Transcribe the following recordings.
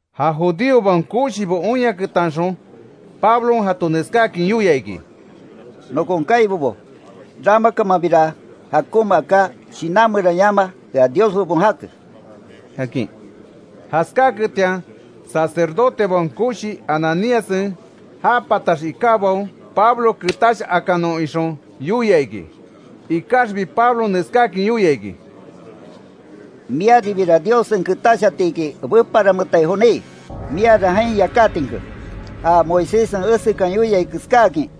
Ja judíobaon koshibo oinyaketanxon Pablon jato neskáakin yoia iki: —Nokon kaibobo, ramakamanbira jakonma aká, shinan meran yama, ea Dios bebon jake —akin. Jaskáketian, sacerdotebaon koshi Ananíassen, já patax ikábaon Pablo, ketash akanon ixon yoia iki. Ikaxbi Pablon neskáakin yoia iki: —¡Miaribira Diossen ketash atiki, beparametai joní! Miara jain yakátinke ja Moiséssen esekan yoiai keskáakin,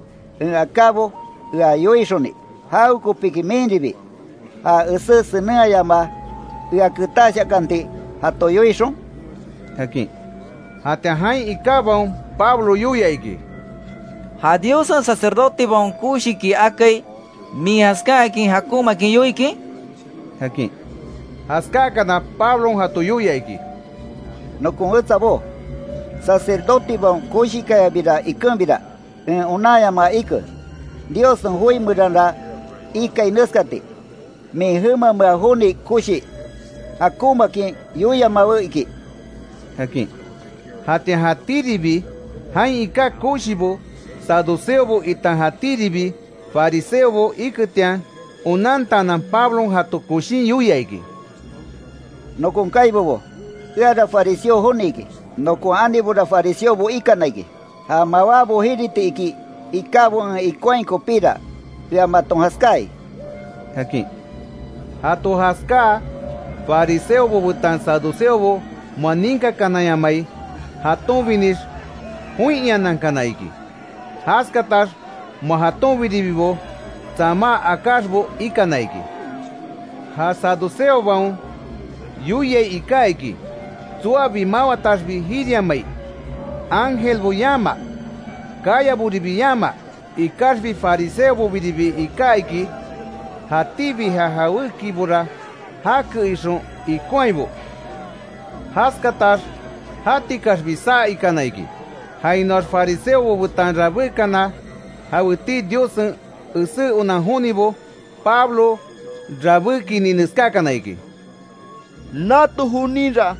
en akábo ea yoixoni ¿Jawekopiki minribi, ja esé senenhayamaa, ea ketash akanti jato yoixon? —akin. Jatian jain ikábaon, Pablo yoia iki: —¿Ja Diossen sacerdotebaon koshiki akai, min jaskáakin jakonmaakin yoikin? —akin. Jaskáakana, Pablon jato yoia iki: —Nokon wetsabó, sacerdotebaon koshikayabira ikenbira, en onanyamaa ike, Diossen joi meranra ikai neskati: ‘Min jemamea joni koshi jakonmaakin yoiamawe’, iki —akin. Jatian jatíribi jain iká koshibo saduceobo, itan jatíribi fariseobo iketian onantaanan, Pablon jato koshin yoia iki: —Nokon kaibobo, eara fariseo joni iki. Nokon anibora fariseobo ikana iki. Ja mawábo jiriti iki ikábo en ikonhai kopíra, ea maton jaskáai —akin. Jato jaskáa, fariseobo betan saduceobo, moa ninkakananyamai jatonbinix, join iananankana iki. Jaskatax moa jatonbiribibo tsamá akáxbo ikana iki. Ja saduceobaon yoiai iká iki, tsoabi mawataxbi jiriamai; ángelbo yamaa, kayaboribi yamaa. Ikaxbi farisebobiribi iká iki, jatíbi ja jawékibora jake, ixon ikonhaibo. Jaskatax jatikaxbi saa ikana iki, jainoax fariseobo betan rabékana jawetii Diossen esé onan jonibo, Pablo rabékiini, neskákana iki: —Nato joninra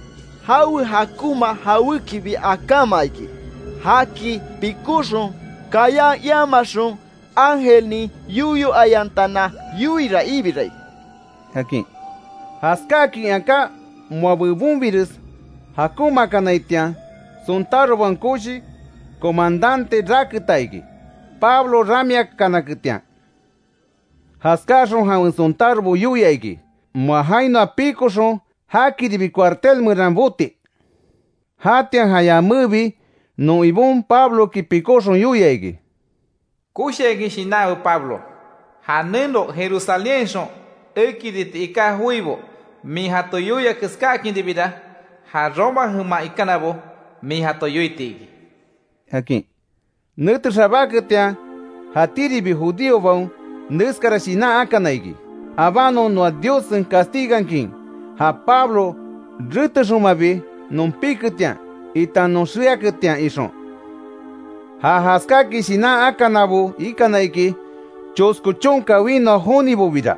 jawe jakonma jawékibi akáma iki. Jaki pikóxon, kayan iamaxon ángelnin yoyo ayantana yoiira ibirai —akin. Jaskáakin aká, moa bebonbires jakonmakanaitian, sontárobaon koshi comandante raketa iki, Pablo ramiakanaketian. Jaskáxon jawen sontárobo yoia iki, moa jainoa pikoxon, jakiribi cuartel meran boti. Jatian ja yamébi non Ibon Pabloki pikóxon, yoia iki: “Koshiakin shinanwe Pablo. Ja neno Jerusalénhainxon ekiriti iká joibo min jato yoia, keskáakinribira ja Roma jeman ikanabo min jato yoiti iki”, akin. Nete xabáketian jatíribi judíobaon, neskara shinan akana iki: abanon, noa Diossen castigankin ja Pablo retexonmabi non piketian itan non xeaketian, ixon. Ja jaskáakin shinan akanabo ikana iki, chosko chonka winoa jonibobira.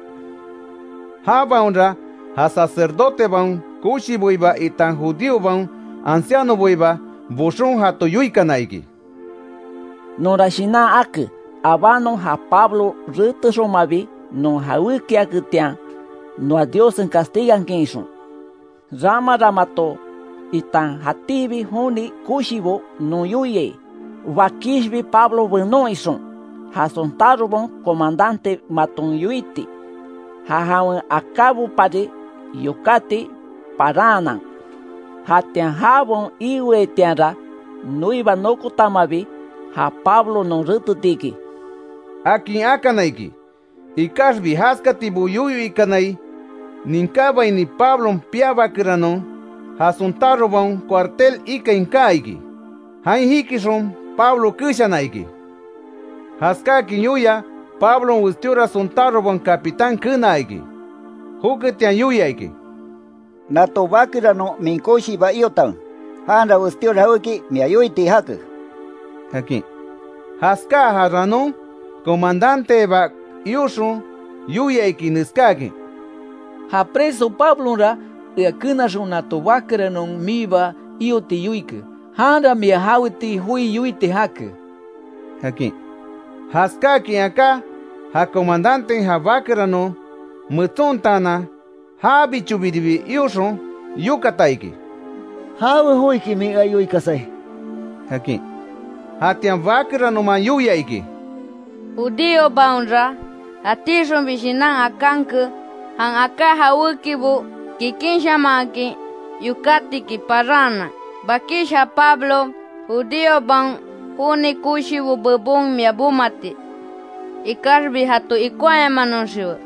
Jabaonra ja sacerdotebaon koshiboiba itan judíobaon ancianoboiba boxon, jato yoikana iki: —Nonra shinan ake, abanon ja Pablo retexonmabi non jawékiaketian, noa Diossen castigankin ixon. Ramara mato itan jatíbi joni koshibo non yoiai, bakishbi Pablo benon ixon, ja sontárobaon comandante maton yoiti: Ja jawen akábopari yokátiki paranhanan. Jatian jabaon iweaitianra noiba nokotamabi, ja Pablo non reteti iki —akin akana iki. Ikaxbi jaskatibo yoyo ikanai ninkábaini, Pablon piabakeranon, ja sontárobaon cuartel ikain kaa iki, jain jikixon Pablo keshana iki. Jaskáakin yoia, Pablon westíora sontárobaon capitán kenaa iki. Joketian, yoia iki: —Nato bakeranon min koshiiba iotanwe. Janra westíora jawéki mia yoiti jake —akin. Jaskáa ja ranon, comandanteba ioxon yoia iki, neskáakin: —Ja preso Pablonra, ea kenaxon nato bakeranon miiba ioti yoike, janra mia jawetii joi yoiti jake —akin. Jaskáakin aká, ja comadanten, ja bakeranon metsontaanan, jabichobiribi ioxon, yokata iki: —¿Jawe joiki min ea yoikasai? —akin. Jatian bakeranoman yoia iki: —Judíobaonra, jatixonbi shinan akánke, jan aká jawékibo kikinshamanhakin yokátiki paraanan, bakish ja Pablo, judíobaon joni koshibo bebon mia bomati. Ikaxbi jato ikonhayamanoxiwe.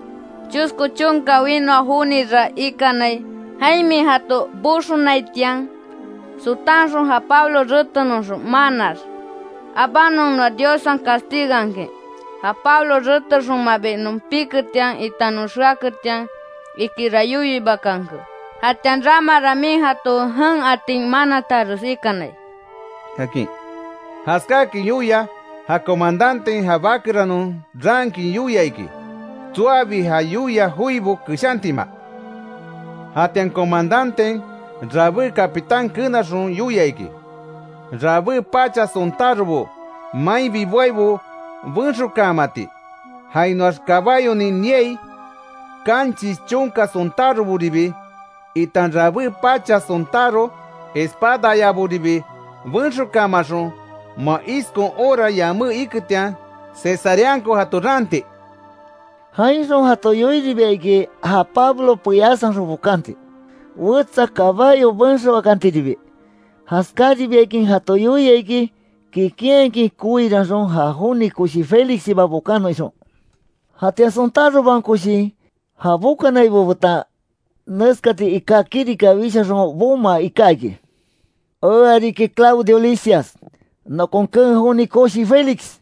Chosko chonka winoa jonira ikanai, jain min jato boxonaitian, sotanxon ja Pablo retenoxon, manaax. Abánon noa Diossen castigankin, ja Pablo retexonmabi non piketian itan non xeaketian, ikira yoyo iibakanke, jatian ramara min jato jen atin manataxes ikanai —akin. Jaskáakin yoia ja comadanten, ja bakeranon raankin yoia iki, tsoabi ja yoia joibo keshantima. Jatian comandanten, rabé capitán kenaxon yoia iki, rabé pacha sontárobo mainbi boaibo benxokaamati, jainoax kabáyonin niai kanchis chonka sontároboribi, itan rabé pacha sontáro espadayaboribi benxokaamaxon, moa iskon hora yamé iketian, Cesareanko jato raanti. Jainxon jato yoiribia iki, ja Pablo peyásanxon bokanti, wetsa kabayo benxoakantiribi. Jaskaribiakin jato yoia iki, kikinhakin koiranxon, ja joni koshi Félixiba bokanon ixon. Jatian sontárobaon koshin, ja bokanaibo betan neskati iká kirika wishaxon, bomaa iká iki: “Ea riki Claudio Lisias, nokon keen joni koshi Félix,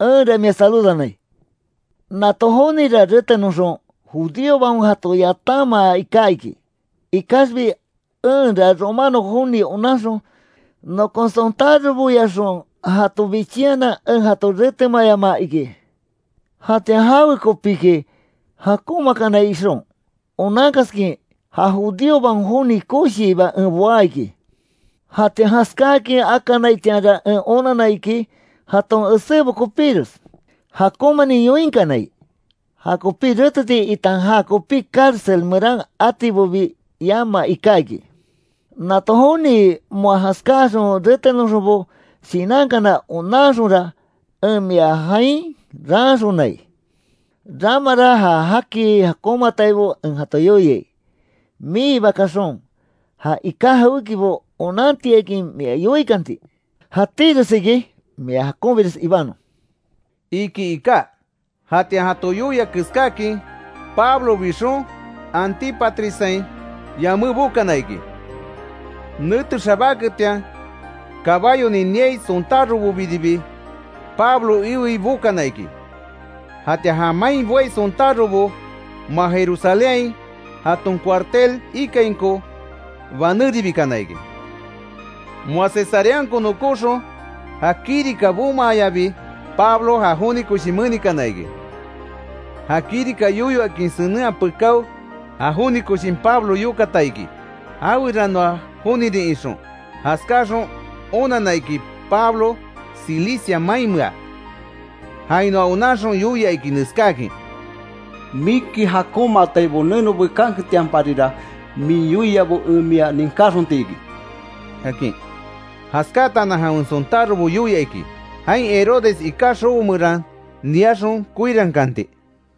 enra mia saludanai. Nato jonira retenoxon, judíobaon jato yatanmaa iká iki, ikaxbi enra romano joni onanxon, nokon sontároboyaxon jato bichinhanan, en jato retemayamaa iki. Jatian jawekopiki jakonmaakanai ixon, onankaskin, ja judíobaon joni koshiiba en boá iki. Jatian jaskáakin akanaitianra, en onanna iki, jaton esébo kopíres jakonmanin yoinkanai. Jakopi reteti itan jakopi cárcel meran atibobi, yama iká iki. Nato joni moa jaskáaxon retenoxonbo, shinankana onanxonra, en mia jain raanxonai. Ramara ja jaki jakonmataibo en jato yoiai, miiba kaxon, já iká jawékibo onantiakin mia yoikanti. Jatíres iki. Mia jakonbires ibanon”, iki iká. Jatian jato yoia keskáakin, Pablo bixon, Antípatrissain yamé bokana iki. Nete xabáketian, kabáyonin niai sontárobobiribi, Pablo iwei bokana iki. Jatian ja main boai sontárobo, moa Jerusalénhain jaton cuartel ikainko banéribikana iki. Moa Cesareanko nokóxon, ja kirika bomaayabi, Pablo ja joni koshi menikana iki. Ja kirika yoyo akin senenhaa pekáo, ja joni koshin, Pablo yokata iki, jaweranoa jonirin ixon. Jaskáaxon onanna iki, Pablo Cilicia mainmea. Jainoa onanxon yoia iki neskáakin: —Miki jakonmataibo neno bekanketianparira min yoiabo en mia ninkáxonti iki —akin. Jaskáataanan, jawen sontárobo yoia iki, jain Herodes iká xobo meran niaxon koirankanti.